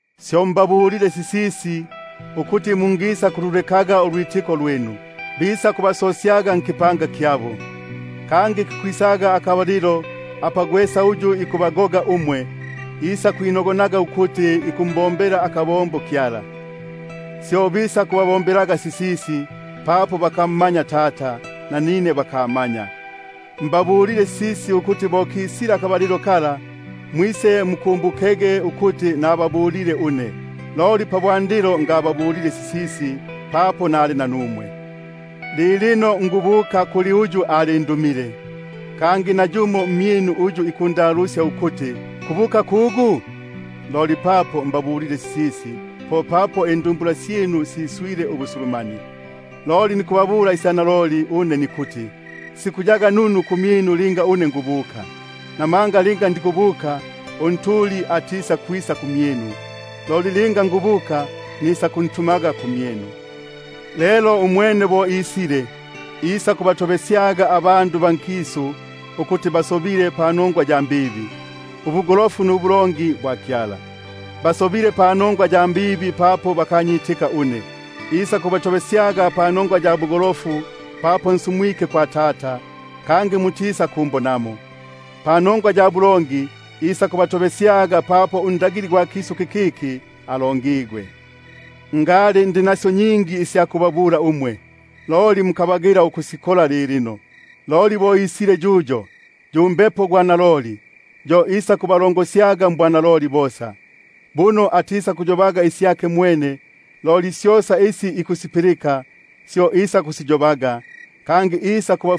Syo mbabulile sisisi ukuti singisakubapesyaga. Bisakubasosyaga mmaSinagogi; naloli kikwisaga akabalilo apa gwesa uyu ikubagoga, isakwinogonaga ukuti ikumbombela akabombo Kyala. Syo bisakubombaga sisisi, papo bakamma- nya Tata, nanine bakamanya. Mbabulile sisisi ukuti bo kisile akabalilo kala, mwisemukumbukege ukuti nababulile une. Loli pabwandilo ngababulile sisisi, papo nali nanumwe. Loli lilino nikubuka kuli uyu alindumile une, kangi nayumo mmyinu atikundalusya ukuti: Kubuka kugu? Loli papo mbabulile sisisi, popapo indumbula syinu siswile ubusulu- manie. Loli nikubabula isya naloli une nikuti: Sikuyaga nunu kumyinu linga nikubuka; buno linga ndikubuka, Unjili atisakwisa kumyinu, loli linga nikubuka, nisakuntumaga kumyinu. Lelo umwene bo isile, isakukitobesyaga ikisu panongwa ya mbibi, nubugolofu, nubulongi. Panongwa ya mbibi, isakukitobesyaga papo bakanyitika une; panongwa ya bugolofu, isakukitobesyaga papo nsumwike kwa Tata kangi mutisakumbonamo; panongwa ya bulongi, isakukitobesyaga papo unkulumba gwa kisu kikiki alongigwe. Ngali ndi nasyo nyingi isya kubabula, loli mukabagila ukusikola lilino. Loli linga isile yuyo, yu Mbepo gwa naloli, yo isakubalongosyaga mbwanaloli bosa; buno atisakuyobaga isyake mwene, loli syosa isi ikusipilika, syo isakusiyobaga; kangi isakuba-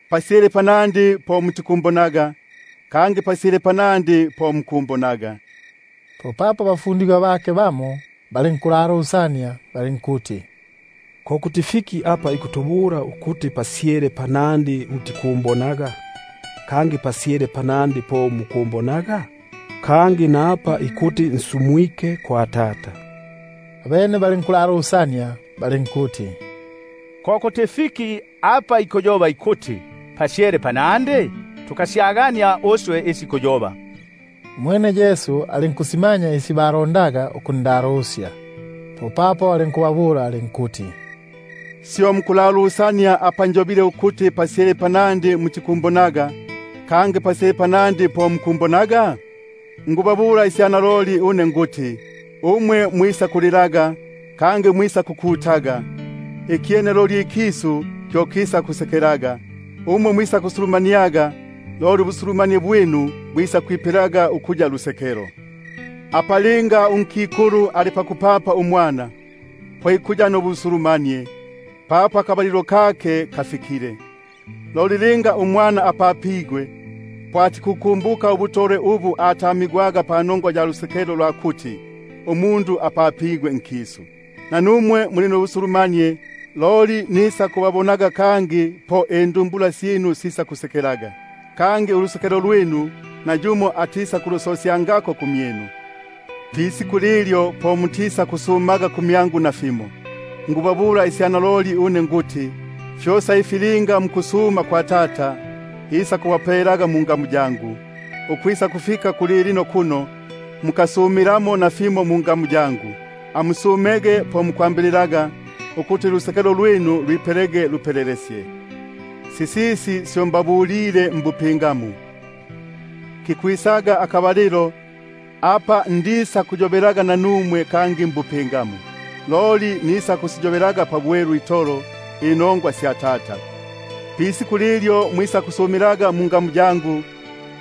Pasyale panandi po mutikumbonaga, kangi pasyele panandi po mukunibonaga. Popapo abafundigwa bake bamo balinkulalusania balinkuti: Fyo fiki ifi ikutubula ikuti pasyele panandi mutikumbonaga, kangi pasyele panandi po mukunibonaga? Napa ikuti, nsumwike kwa Tata. Abene balinkuti: Fyo fiki ifi ikuyoba ikuti, pasyele panandi? Tukasyagania uswe isi ikuyoba. Umwene Yesu alinkusimanya isi balondaga ukundalusya, popapo alinkubabula alinkuti: Syo mukulalusania apa njobile ukuti pasyele panandi mutikumbonaga, kangi pasyele panandi po mukumbonaga? Naloliloli nikubabula une nikuti, umwe mwisakulilaga, kangi mwisakukutaga, ikyene ikisu loli kyo kisakusekelaga; umwe mwisakusulumaniaga, loli ubusulumanie bwinu bwisakwipelaga ukuya lusekelo. Apa linga unkikulu ali pakupapa umwana, po ikuya nubusulumanie, papo akabalilo kake kafikile; loli linga umwana apapigwe, po atikubukumbuka ubutolwe panongwa ya lusekelo lwa kuti, umundu apapigwe nkisu. Nanumwe lelo muli nubusulumanie, loli nisakubabonaga kangi, po indumbula syinu sisakusekelaga, kangi ulusekelo lwinu nayumo atisakulusosya- ngapo pamyinu. Pisiku lilyo po mutisakundalusyaga une nasimo. Naloliloli nikubabula une nikuti, fyosa ifi linga mukusuma kwa Tata, fyo isakubapelaga mungamu yangu. Ukwisakufika kulilino kuno, mukasumilamo nafimo mungamu yangu; amusumege po mukwambililaga, ukuti ulusekelo lwinu lwipelege lupelelesye. Sisisi syo mbabulile mbupingamu, kikwisaga akabalilo apa ndisakuyobelaga nanumwe kangi mbupingamu, loli nisakusi- yobaga pabwelu itolo inongwa sya Tata. Pisiku lilyo mwisakusumilaga mungamu yangu,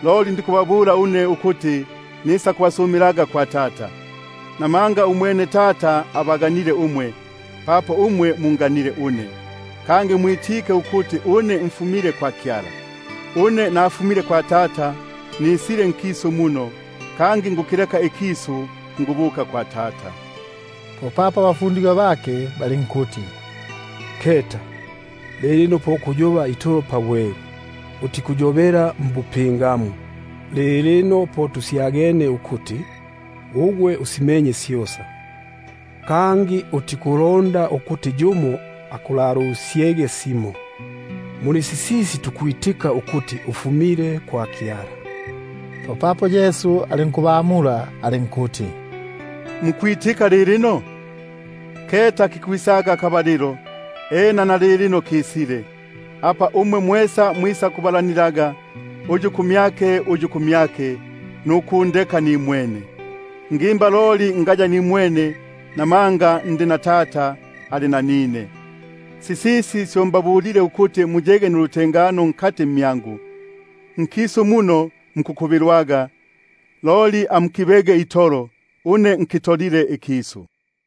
loli ndikubabula une ukuti nisakubasumilaga kwa Tata. Namanga umwene Tata abaganile umwe, papo umwe munganile une, kangi mwitike ukuti une mfumile kwa Kyala. Une nafumile kwa Tata, nisile nkisu muno; kangi nikukilekaga ikisu, nikubukaga kwa Tata. Popapo abafundigwa bake balinkuti: Keta, lilino po kuyoba itolo pabwelu, utikuyobela mbupingamu. Lilino po tusyagenie ukuti, ugwe usimenye syosa, kangi utikulonda ukuti yumo akulalusyege simo; muli sisisi tukwitika ukuti ufumile kwa Kyala. Popapo Yesu alinkubamula alinkuti: Mukwitika lilino? Keta kikwisaga akabalilo, ena nalilino kisile, apa mwisakunyambanigwaga uyu kumyake uyu kumyake, nukundeka nimwene; loli ngaya nimwene, buno Tata ali nanine. Sisisi syo mbabulile, ukuti muyege nulutengano mmyangu. Nkisu muno muli nulukubilo, loli amukibege itolo, une nkitolile ikisu.